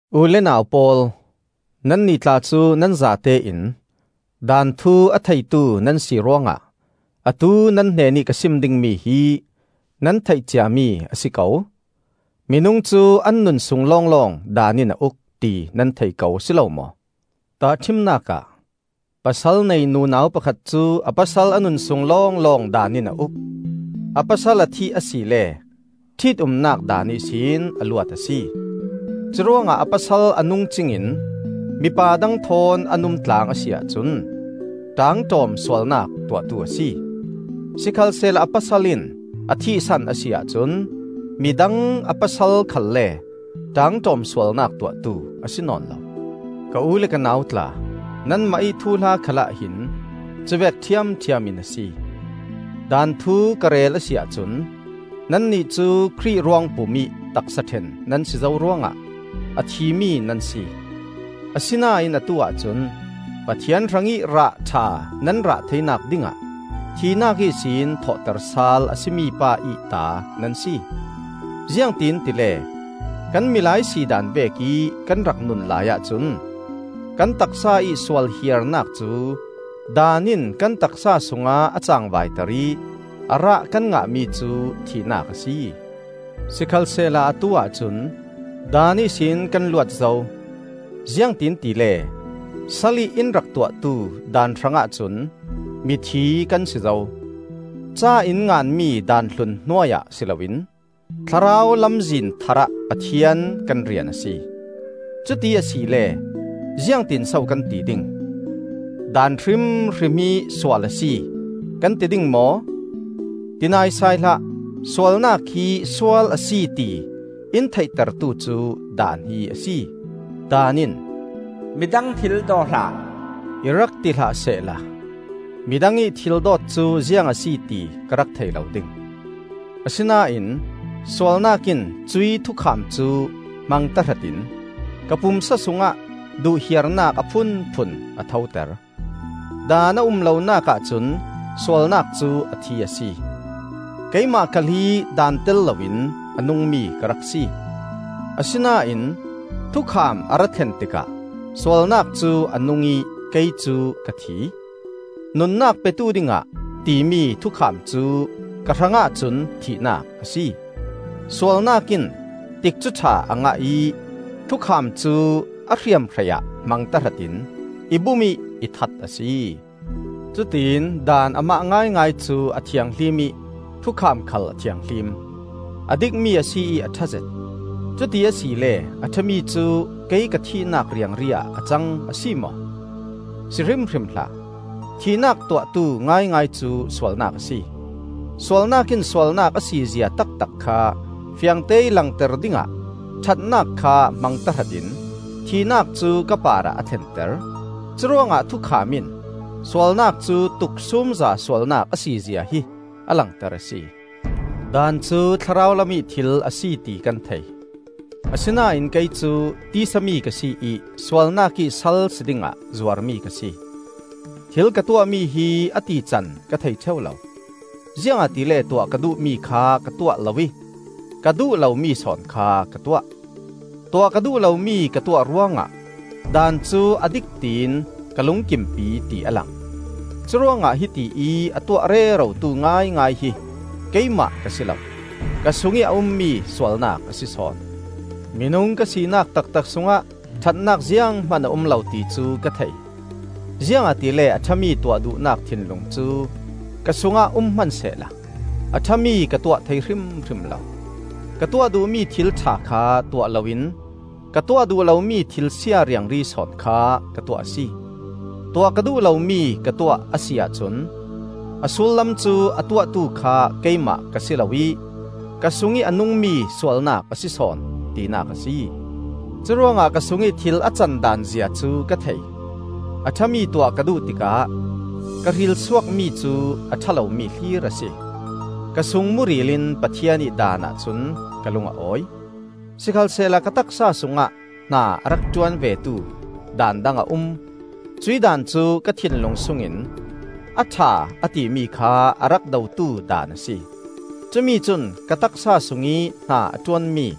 U le nau pawl, nannih tla cu nan zatein daan thu a theitu nan si ruangah atu nan hnenih ka sim dingmi hi nan theih ciami a si ko. Minung cu an nunsung lawnglawng daan in a uk, ti nan thei ko a si lo maw? Tahṭhimnak ah, pasal nei nunau pakhat cu a pasal a nunsung lawnglawng daan in a uk; a pasal a thih asile ṭhit-umnak daan ihsin a luat a si. Curuangah a pasal a nung cingin mipa dang thawn an umtlang a si ahcun ṭaangṭawm sualnak tuahtu a si; sikhalsehla a pasal in a thihsan a si ahcun midang a pasal khalle ṭaangṭawm sualnak tuahtu a si nawn lo. Ka u le ka nau tla, nanmah ih thuhla khalah hin cuvek ṭhiamṭhiam in a si. Daan thu ka rel a si ahcun, nannih cu Khrih ruangpum ih taksa ṭhen nan si zo ruangah a thimi nan si. Asinain atu-ah cun Pathian hrangih rah ṭha nan rah theinak dingah thihnak ihsin thawhter sal a si mi pa ih ta nan si. Ziangtin tile, kan milai si daan vekih kan rak nun laiah cun kan taksa ih sualhiarnak cu Daan in kan taksa sungah a cangvaiter ih a rah kan ngahmi cu thihnak a si. Sikhalsehla atu-ah cun Daan ihsin kan luat zo; ziangtin tile salih in rak tuahtu Daan hrangah cun mithi kan si zo. Ca in nganmi Daan hlun hnuai ah si loin Thlarau lamzin tharah Pathian kan rian a si. Cuti asile ziangtinso kan ti ding? Daan hrimhrim hi sual a si, kan ti ding maw? Ti naisai hlah! Sualnak hi sual a si ti in theitertu cu Daan hi a si. Daan in, “Midang thil daw hlah,” i rak ti hlah sehla midang ih thil dawt cu ziang a si ti ka rak thei lo ding. Asinain sualnak in cuih thukham cu hmang tahratin ka pumsa sungah duhhiarnak a phunphun a thoter. Daan a um lonak ahcun sualnak cu a thi a si. Keimah khal hi daan tel loin a nungmi ka rak si; asinain thukham a ra thlen tikah sualnak cu a nung ih kei cu ka thi. Nunnak petu dingah timi thukham cu ka hrangah cun thihnak a si. Sualnak in tikcu ṭha a ngah ih thukham cu a hriamhrei ah hmang tahratin i bum ih i that a si. Cutiin Daan amah ngaingai cu a thianghlim ih thukham khal a thianghlim, a dikmi a si ih a ṭhazet. Cuti asile a ṭhami cu kei ka thihnak riangri ah a cang, a si maw? Si hrimhrim hlah! Thihnak tuahtu ngaingai cu sualnak a si. Sualnak in sualnak a sizia taktak kha fiangteih langter dingah ṭhatnak kha hmang tahratin thihnak cu ka parah a thlenter. Curuangah thukham in sualnak cu tuksumza sualnak a sizia hi a langter a si. Daan cu thlarau lamih thil a si ti kan thei; asinain kei cu tisa mi ka si ih sualnak ih sal si dingah zuarmi ka si. Thil ka tuahmi hi a tican ka thei ṭheu lo, ziangahtile tuah ka duhmi kha ka tuah lo ih ka duh lomi sawn kha ka tuah. Tuah ka duh lomi ka tuah ruangah Daan cu a dik tiin ka lungkimpi ti a lang. Curuangah hiti ih a tuah rerotu ngaingai hi keimah ka si lo; ka sungih a ummi sualnak a si sawn. Minung ka sinak taktak sungah ṭhatnak zianghman a um lo ti cu ka thei. Ziangahtile a ṭhami tuah duhnak thinlung cu ka sungah um hmansehla a ṭhami ka tuah thei hrimhrim lo. Ka tuah duhmi thil ṭha kha tuah loin ka tuah duh lomi thil sia riangri sawn kha ka tuah a si. Tuah ka duh lomi ka tuah a si ahcun a sullam cu a tuahtu kha keimah ka si lo ih ka sungih a nungmi sualnak a si sawn, tinak a si. Curuangah ka sungih thil a can daanzia cu ka thei - a ṭhami tuah ka duh tikah ka hrilsuakmi cu a ṭha lomi hlir a si. Ka sung muril in Pathian ih daanah cun ka lung a awi. Sikhalsehla ka taksa sungah hna a rak ṭuan vetu daan dang a um; cuih daan cu ka thinlung sungin a ṭha a timi kha a rak dotu daan a si. Cumi cun ka taksa sungih hna a ṭuanmi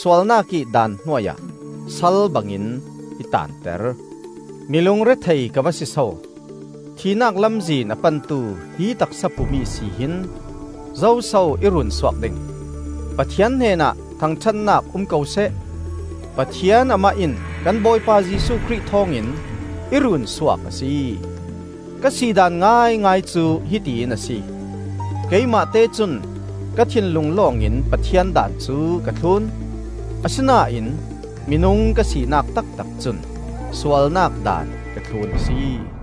sualnak ih daan hnuai ah sal bangin i taanter. Mi lungrethei ka va si so! Thihnak lamzin a pantu hih taksa pum ihsi hin zoso i runsuak ding? Pathian hnenah thangṭhatnak um ko seh: Pathian Amah in kan Bawipa Jesuh Khrih thawng in i runsuak a si. Ka si daan ngaingai cu hiti in a si - Keimahte cun ka thinlung lawngin Pathian daan cu ka thlun; asinain minung ka sinak taktak cun sualnak daan ka thlun a si.